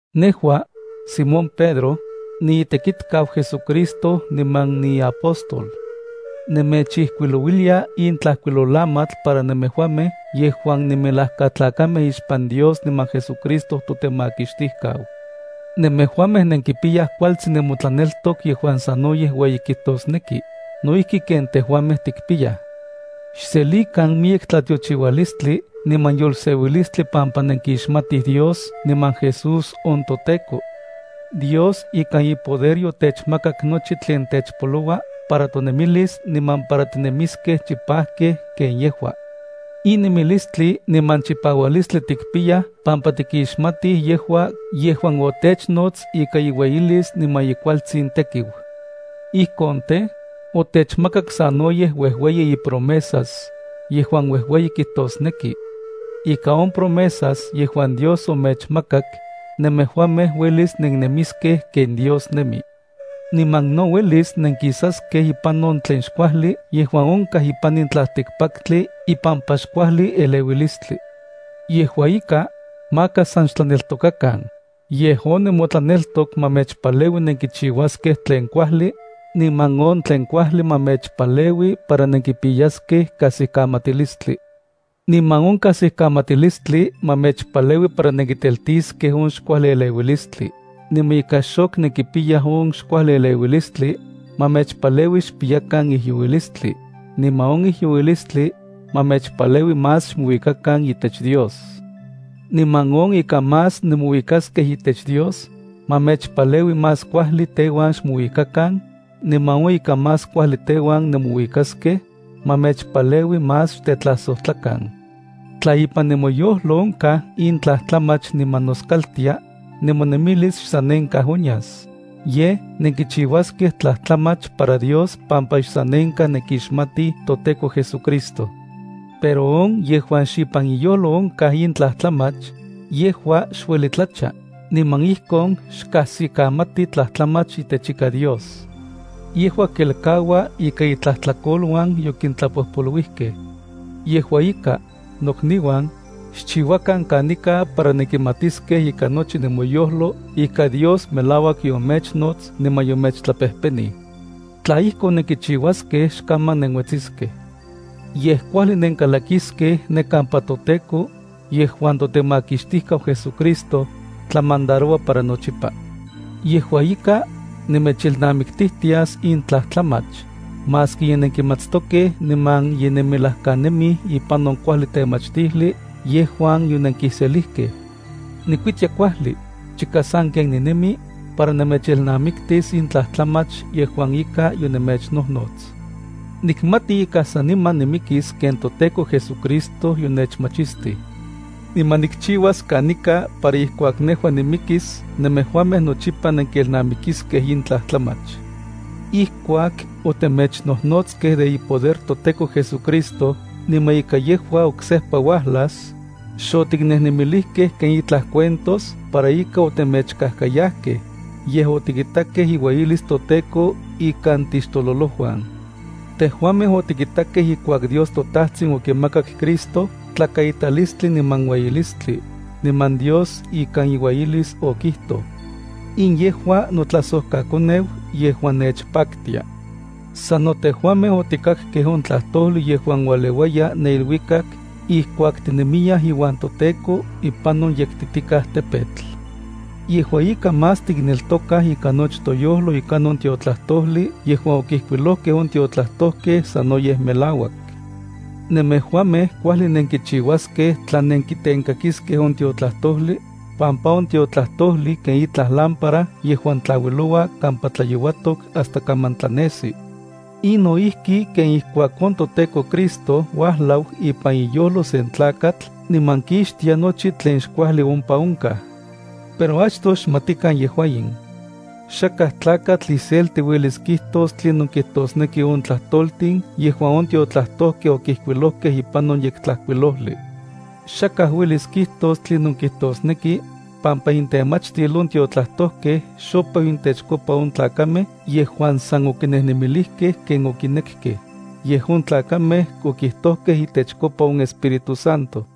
Nejua, Simón Pedro, niitekitkau JesuCristo niman niiapóstol. Nemechijkuilouilia in tlajkuilolamatl para nemejuamej yejuan nenmelajkatlakamej ixpan Dios niman JesuCristo totemakixtijkau. Nemejuamej nenkipiyaj kualtsin nemotlaneltok yejuan sanoyej ueyi kijtosneki, no ijki ken tejuamej tikpiyaj. Xselikan miyek tlatiochiualistli niman yolseuilistli pampa nenkixmatij Dios niman Jesús on toTEKO. Dios ikan ipoder yotechmakak nochi tlen techpoloua para tonemilis niman para tinemiskej chipajkej ken yejua. In nemilistli niman chipaualistli tikpiyaj pampa tikixmatij yejua yejuan otechnots ika iueyilis niman ikualtsin tekiu. Ijkon tej, otechmakak sanoyej uejueyi ipromesas, yejuan uejueyi kijtosneki. Ika on promesas yejuan Dios omechmakak, nemejuamej uelis nennemiskej ken Dios nemi. Niman no uelis nenkisaskej ipan on tlen xkuajli yejuan onkaj ipan in tlaltikpaktli ipampa xkuajli eleuilistli. Yejua ika, maka san xtleneltokakan, yej on nemotlaneltok ma mechpaleui nenkichiuaskej tlen kuajli, niman on tlen kuajli ma mechpaleui nenkipiyaskej kajsikamatilistli, niman on kajsikamatilistli ma mechpaleui nenkiteltiskej on xkuajli eleuilistli, niman ika xok nenkipiyaj on xkuajlieleuilistli, ma mechpaleui xkipiyakan ijyouilistli, niman on ijyouilistli, ma mechpaleui más xmouikakan itech Dios, niman on ika más nemouikaskej itech Dios, ma mechpaleui más kuajli teuan xmouikakan, niman on ika más kuajli teuan nemouikaskej, ma mechpaleui más xtetlajsojtlakan. Tla ipan nemoyojlo onkaj in tlajtlamach niman noskaltia, nemonemilis xsanenkaj onyas, yej nenkichiuaskej tlajtlamach para Dios pampa xsanenkaj nenkixmatij toTEKO JesuCristo. Pero on yejuan xipan iyojlo onkaj in tlajtlamach, yejua xueli tlacha, niman ijkon xkajsikamati tlajtlamach itech ika Dios. Yejua kelkaua ika itlajtlakoluan yokintlapojpoluijkej. Yejua ika, nokniuan, xchiuakan kanika para nenkimatiskej ikan nochi nemoyojlo ika Dios melauak yomechnots niman yomechtlapejpenij. Tla ijkon, nenkichiuaskej xkaman nenuetsiskej. Yej kuajli nenkalakiskej ne kampa toTEKO, yejuan toTemakixtijkau JesuCristo, tlamandaroua para nochipa. Yejua ika, nemechelnamiktijtias in tlajtlamach, maski ye nenkimatstokej niman ye nenmelajkanemij ipan on kuajli temachtijli yejuan yonenkiselijkej. Nikuitia kuajli, chika sanken ninemi, para nemechelnamiktis in tlajtlamach yejuan ika yonemechnojnots. Nikmati ika saniman nimikis ken toTEKO JesuCristo yonechmachistij. Niman nikchiuas kanika para ijkuak nejua nimikis nemejuamej nochipa nenkelnamikiskej in tlajtlamach. Ijkuak otemechnojnotskej de ipoder toTEKO JesuCristo niman ika yejua oksejpa uajlas, xotiknejnemilijkej ken itlaj cuentos para ika otemechkajkayajkej, yej otikitakej iueyilis toTEKO ikan tixtololojuan. Tejuamej otikitakej ijkuak Dios toTajtsin okimakak Cristo tlakaitalistli niman ueyilistli, niman Dios ikan iueyilis okijtoj: “In yejua notlajsojkaKoneu yejuan nechpaktia.” Sano tejuamej otikakkej on tlajtojli yejuan ualeuaya ne iluikak ijkuak tinemiyaj iuan toTEKO ipan on yektitikaj tepetl. Yejua ika más tikneltokaj ikan nochi toyojlo ika on tiotlajtojli yejuan okijkuilojkej on tiotlajtojkej sanoyej melauak. Nemejuamej kuajli nenkichiuaskej tla nenkitenkakiskej on tiotlajtojli, pampa on tiotlajtojli ken itlaj lámpara yejuan tlauiloua kampa tlayouatok hasta kaman tlanesi. In no ijki ken ijkuak on toTEKO Cristo uajlau ipan iyojlo sen tlakatl niman kixtia nochi tlen xkuajli ompa onkaj. Pero achtoj xmatikan yejua in. Xakaj tlakatl iselti uelis kijtos tlinon kijtosneki on tlajtoltin yejuan on tiotlajtojkej okijkuilojkej ipan on Yektlajkuilojli. Xakaj uelis kijtos tlinon kijtosneki, pampa intemachtil on tiotlajtojkej xopeu intechkopa on tlakamej yejuan san okinejnemilijkej ken okinekkej, yej on tlakamej okijtojkej itechkopa on Espíritu Santo.